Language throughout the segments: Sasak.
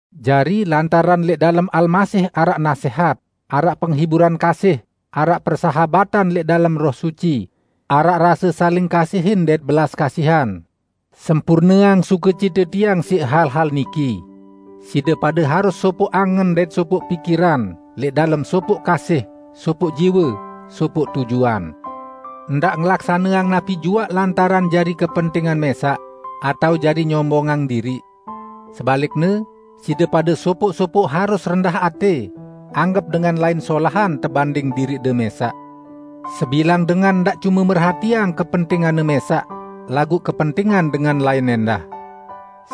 Jari, lantaran lẽq dalem Almasih araq nasẽhat, araq penghiburan kasih, araq persahabatan lẽq dalem Roh Suci, araq rase saling kasihin dait belas kasihan, sempurneang sukecite tiang siq hal-hal niki: Side pade harus sopoq angen dait sopoq pikiran, lẽq dalem sopoq kasih, sopoq jiwe, sopoq tujuan. Ndaq ngelaksaneang napi juaq lantaran jari kepentingan mẽsaq, atao jari nyombongang diriq. Sebalikne, side pade sopoq-sopoq harus rendah atẽ anggep dengan lain solahan tebanding diriqde mẽsaq. Sebilang dengan ndaq cume merhatiang kepentinganne mẽsaq, laguq kepentingan dengan lain ẽndah.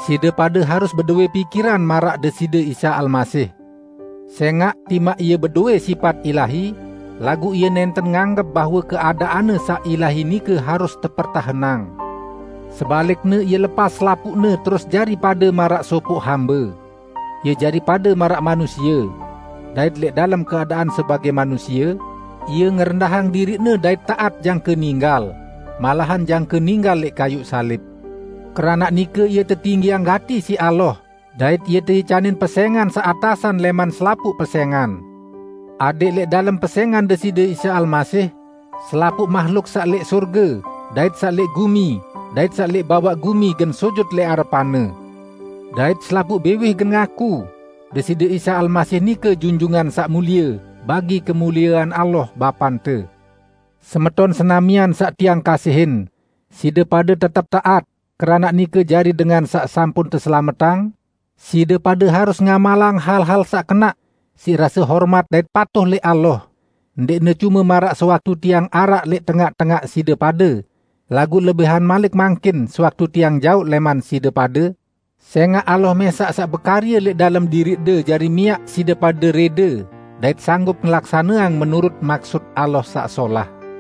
Side pade harus bedowẽ pikiran maraq Deside Isa Almasih: Sẽngaq timaq Ie bedowẽ sipat ilahi, laguq Ie nẽnten nganggep bahwe keadaan-Ne saq ilahi nike harus tepertahenang. Sebalikne, Ie lepas selapuqne terus jari pade maraq sopoq hambe. Ie jari pade maraq manusie. Dait lẽq dalem keadaan sebagẽ manusie, Ie ngerendahang diriq-Ne dait taat jangke ninggal -- malahan jangke ninggal lẽq kayuq salib. Keranaq nike Ie tetinggiang gati siq Allah dait Ie teicanin pesẽngan saq atasan lẽman selapuq pesẽngan. Adẽq lẽq dalem pesẽngan Deside Isa Almasih, selapuq mahluk saq lẽq sorge, dait saq lẽq gumi, dait saq lẽq bawaq gumi, gen sujut lẽq arepan-Ne. Dait selapuq biwih gen ngaku, "Deside Isa Almasih nike Junjungan Saq Mulie," bagi kemuliean Allah, Bapante. Semeton senamian saq tiang kasihin, side pade tetep taat, keranaq nike jari dengan saq sampun teselametang, side pade harus ngamalang hal-hal saq kenaq, siq rase hormat dait patuh lẽq Allah, ndẽqne cume maraq sewaktu tiang araq lẽq tengaq-tengaq side pade, laguq lebihan malik mangkin, sewaktu tiang jaoq lẽman side pade, sẽngaq Allah mẽsaq saq bekarye lẽq dalem diriqde jari miaq side pade rẽde dait sanggup ngelaksaneang menurut maksut Allah saq solah.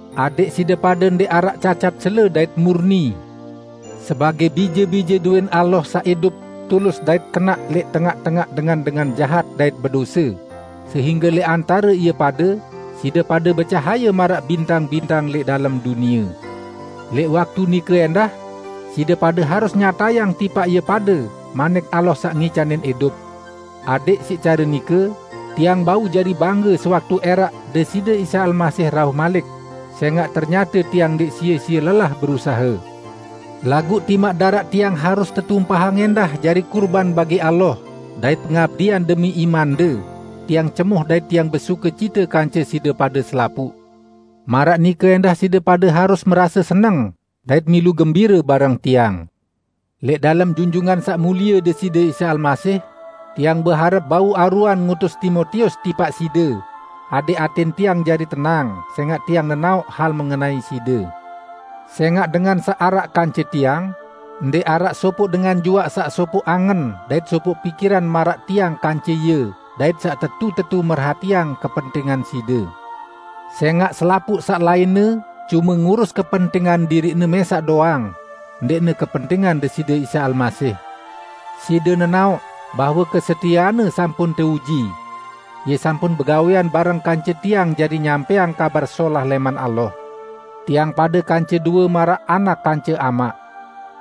Adẽq side pade ndẽq araq cacat cele dait murni, sebagẽ bije-bije dowẽn Allah saq idup tulus dait kenaq lẽq tengaq-tengaq dengan-dengan jahat dait bedose, sehingge lẽq antare ie pade, side pade becahaye maraq bintang-bintang lẽq dalem dunie. Lẽq waktu nike ẽndah, side pade harus nyatayang tipaq ie pade Manik Allah saq ngicanin idup. Adẽq siq care nike, tiang bau jari bangge sewaktu ẽraq Deside Isa Almasih rauh malik, sẽngaq ternyate tiang ndẽq sie-sie lelah berusahe. Laguq timaq daraq tiang harus tetumpahang ẽndah jari kurban bagi Allah dait pengabdian demi imande, tiang cemoh dait tiang besukecite kance side pade selapuq. Maraq nike ẽndah side pade harus merase seneng dait milu gembire bareng tiang. Lẽq dalem Junjungan Saq Mulie Deside Isa Almasih, tiang beharep bau aruan ngutus Timotius tipaq side, adẽq atẽn tiang jari tenang sẽngaq tiang nenaoq hal mengenai side. Sẽngaq dengan saq araq kance tiang, ndẽq araq sopoq dengan juaq saq sopoq angen dait sopoq pikiran maraq tiang kance ie dait saq tetu-tetu merhatiang kepentingan side. Sẽngaq selapuq saq lainne cume ngurus kepentingan diriqne mẽsaq doang, ndẽqne kepentingan Deside Isa Almasih. Side nenaoq bahwe kesetieanne sampun teuji. Ie sampun begawẽan bareng kance tiang jari nyampẽang Kabar Solah lẽman Allah. Tiang pade kance due maraq anak kance amaq.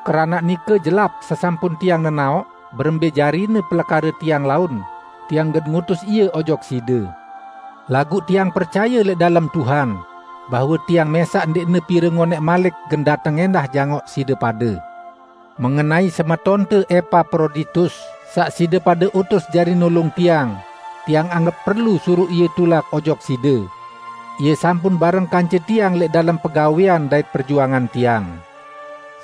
Keranaq nike jelap sesampun tiang nenaoq berembẽ jarine pelekare tiang laun, tiang gen ngutus ie ojok side. Laguq tiang percaye lẽq dalem Tuhan, bahwe tiang mẽsaq ndẽqne pire ngonẽq malik gen dateng ẽndah jangoq side pade. Mengenai semetonte Epaproditus, saq side pade utus jari nulung tiang, tiang anggep perlu suruq ie tulak ojok side. Ie sampun bareng kance tiang lẽq dalem pegawẽan dait perjuangan tiang.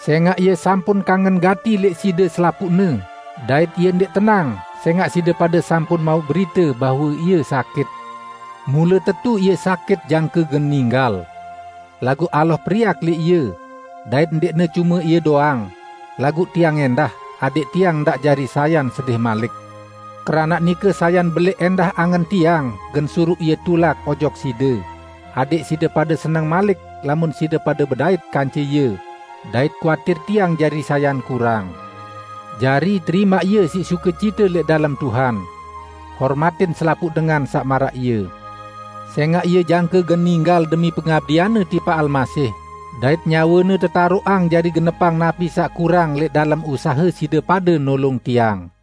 Sẽngaq ie sampun kangen gati lẽq side selapuqne, dait ie ndẽq tenang sẽngaq side pade sampun mauq berite bahwe ie sakit. Mule tetu ie sakit jangke gen ninggal. Laguq Allah periak lẽq ie; dait ndẽqne cume ie doang, laguq tiang ẽndah, adẽq tiang ndaq jari sayan sedih malik. Keranaq nike sayan belẽq ẽndah angen tiang gen suruq ie tulak ojok side, adẽq side pade seneng malik lamun side pade bedait kance ie, dait kuatir tiang jari sayan kurang. Jari, terimaq ie siq sukecite lẽq dalem Tuhan. Hormatin selapuq dengan saq maraq ie. Sẽngaq ie jangke gen ninggal demi pengabdianne tipaq Almasih dait nyawene tetaroqang jari genepang napi saq kurang lẽq dalem usahe side pade nulung tiang.